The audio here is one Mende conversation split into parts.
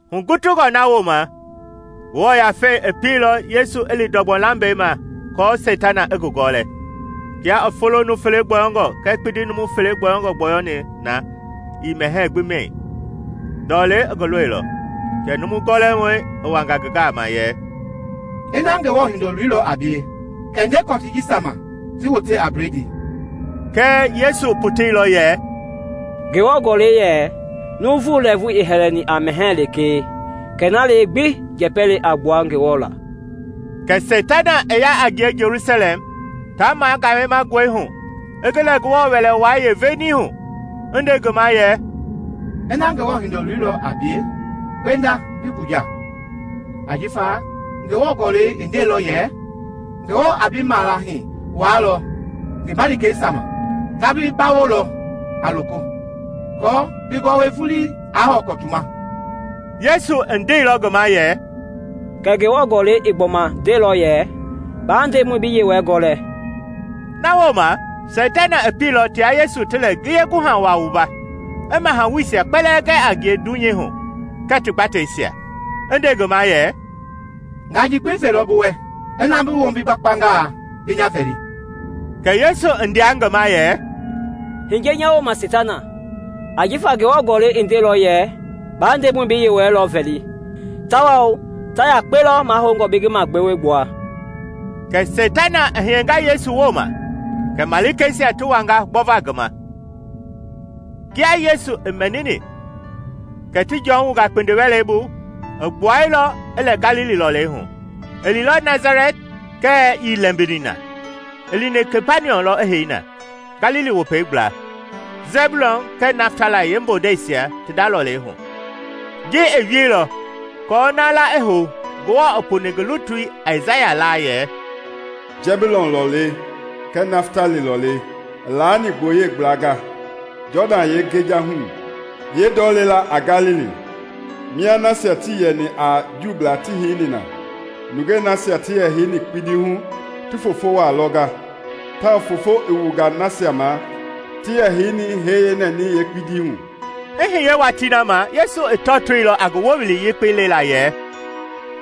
Hugutungɔ na wooma Ngewɔ Yafei i pielɔ Yesu i li ndɔgbɔ lambɛi ma aako Seitana i ngi gɔlɛ. Kia i folo numu fele gbɔyɔngɔ kɛɛ kpindi numu fele gbɔyɔngɔ gbɔyɔni na ii mɛhɛɛ gbi mɛi, ndɔlei i ngi lɔilɔ. Kɛ Numu Gɔlɛmɔi i wanga ngi gama yɛ, “Ina Ngewɔ Hindoloi lɔ a bie, kɛ nde kɔtii jisia ma ti wote a bledii.” Kɛɛ Yesu i poteilɔ yɛ, “Ngewɔ Gɔlɛi yɛ, ‘Nuuvu lɛɛvu ii hɛlɛni a mɛhɛɛ lekee, kɛ na lee gbi njɛpɛ le a gbua Ngewɔ laa.’” Kɛ Seitana i ya a ngie Jelusalɛm, ta magayemangɔi, i ngi lɛ Ngewɔ Wɛlei Wai yeeveenii hu, i nde ngi ma yɛ, “Ina Ngewɔ Hindoloi lɔ a bie, gbenda bi gbuja, ajifa Ngewɔ Gɔlɛi i ndeilɔ yɛ, ‘Ngewɔ a bi malaahi wualɔ ngi malikeisia ma; ta bi gbawolɔ a loko, aako bi gɔwɔi vulii aa hɔwɔ kɔtu ma.’” Yesu i ndeilɔ ngi ma yɛ, “Kɛɛ Ngewɔ Gɔlɛi i gbɔma ndeilɔ yɛ, ‘Baa Ndemɔi bi Yewɔɛi gɔlɛ.’” Na wooma Seitana i pieilɔ tia Yesu ti lɛ ngiye guha wa wumba, i mahawuisia kpɛlɛɛ gɛ a ngie dunyei hu kɛɛ ti gbateisia, i nde ngi ma yɛ, “Nga ji gbi velɔ bi wɛ ina bi wombi gbakpangaa bi nya vɛli.” Kɛ Yesu i ndea ngi ma yɛ, “Hiye nya wooma Seitana! Ajifa Ngewɔ Gɔlɛi i ndeilɔ yɛ, ‘Ba Ndemɔi bi Yewɔɛi lɔ vɛli, tawao ta yakpe lɔ mahoungɔ bi ngi magbewe gbua.’” Kɛ Seitana i hiyenga Yesu wooma; kɛ malikeisia ti wanga gbɔva ngi ma. Kia Yesu i mɛnini kɛ ti Jɔn wunga kpindiwɛlei bu, i gbuailɔ, i lɛ Galili lɔlei hu. I liilɔ Nasalɛti kɛɛ ii lɛmbini na; i lini Kapaniɔm lɔ i hei na, Galili Wopei gbla, Sɛbiulɔn kɛɛ Naftali yeembondeisia ti nda lɔlei hu. Ji i wieilɔ aako na la i hou Ngewɔ i puni ngi lutui Aisaya la yɛ, “Sɛbiulɔn lɔlei kɛɛ Naftali lɔlei, i laani gboyei gblanga, Jɔdan yɛi yeengejahui, yeendɔlɛi la a Galili, mia nasia tii yɛni a Juublaa ti heini na! Nungei nasia ti yɛ heini kpindi hu ti foofo wa lɔnga tawao foofo i wunga nasia ma ti yɛ heini hɛi yeenɛnɛi yeekpindii hu.” I hiye watii na ma Yesu i tɔtoilɔ a ngi wowili yekpei lela yɛ,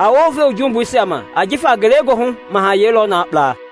“A wounve wu jumbuisia ma ajifa Ngelegoohu Mahayɛi lɔ na kpla!”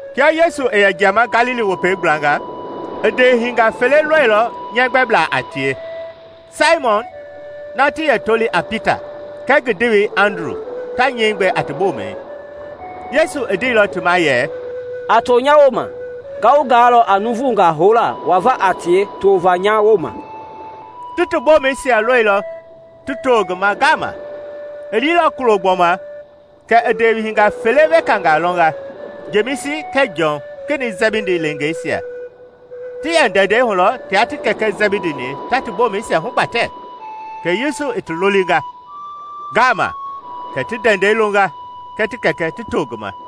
Kia Yesu i yɛ jiama Galili Wopei gblanga, i ndeehinga fele lɔilɔ nyɛɛ gbɛbla a tie, Saimɔn na ti yɛ toli a Pita kɛɛ ngi ndewei Andru ta nyɛi gbɛ a ti bomɛi. Yesu i ndeilɔ ti ma yɛ, “A to nya wooma, nga wu gaalɔ a nuuvungaa houla wava a tie tova nya wooma.” Ti ti bomɛisia lɔilɔ ti to ngi ma ngama. I liilɔ kulo gbɔma kɛ i ndewehinga weka fele lɔnga, Jemisi kɛɛ Jɔn, Kenɛi Sɛbidi leengeisia. Ti yɛ ndɛndɛi hu lɔ tia ti kɛkɛ Jɛbidi-ni ta ti bomɛisia hugbatɛ, kɛ Yesu i ti lolinga. Ngama kɛ ti ndɛndɛi longa kɛɛ ti kɛkɛ ti to ngi ma.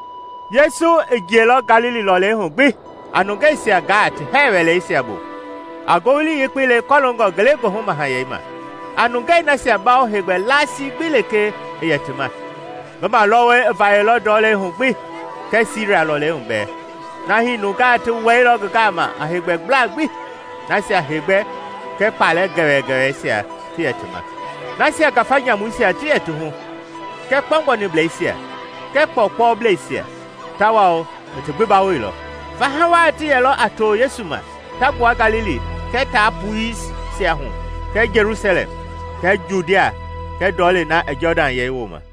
Yesu i jiɛilɔ Galili lɔlei hu gbi a nungeisia gaa ti hɛɛ wɛleisia bu, a Ngowili Yekpei lekɔlongoNgelegoohu Mahayɛi ma, a nungei nasia bawo heegbɛ laasi gbi lekee i yɛ ti ma. Ngi malɔwɔi i vayɛilɔ ndɔlei hu gbi kɛɛ Siria lɔlei bɛɛ, na hii nungaa ti wɛilɔ ngi gama a heegbɛbla gbi, nasia heegbɛ kɛɛ kpalɛ gɛwɛgɛwɛisia ti yɛ ti ma; nasia ngafa nyamuisia ti yɛ ti hu kɛɛ kpɔgbɔniblɛisia kɛɛ kpɔɔkpɔblɛisia, tawao i ti gbi bawoilɔ. Faha waa ti yɛlɔ a to Yesu ma ta gbua Galili kɛɛ Taa Puisia hu kɛɛ Jelusalɛm kɛɛ Judia kɛɛ ndɔlei na i Jɔdan yɛi wooma.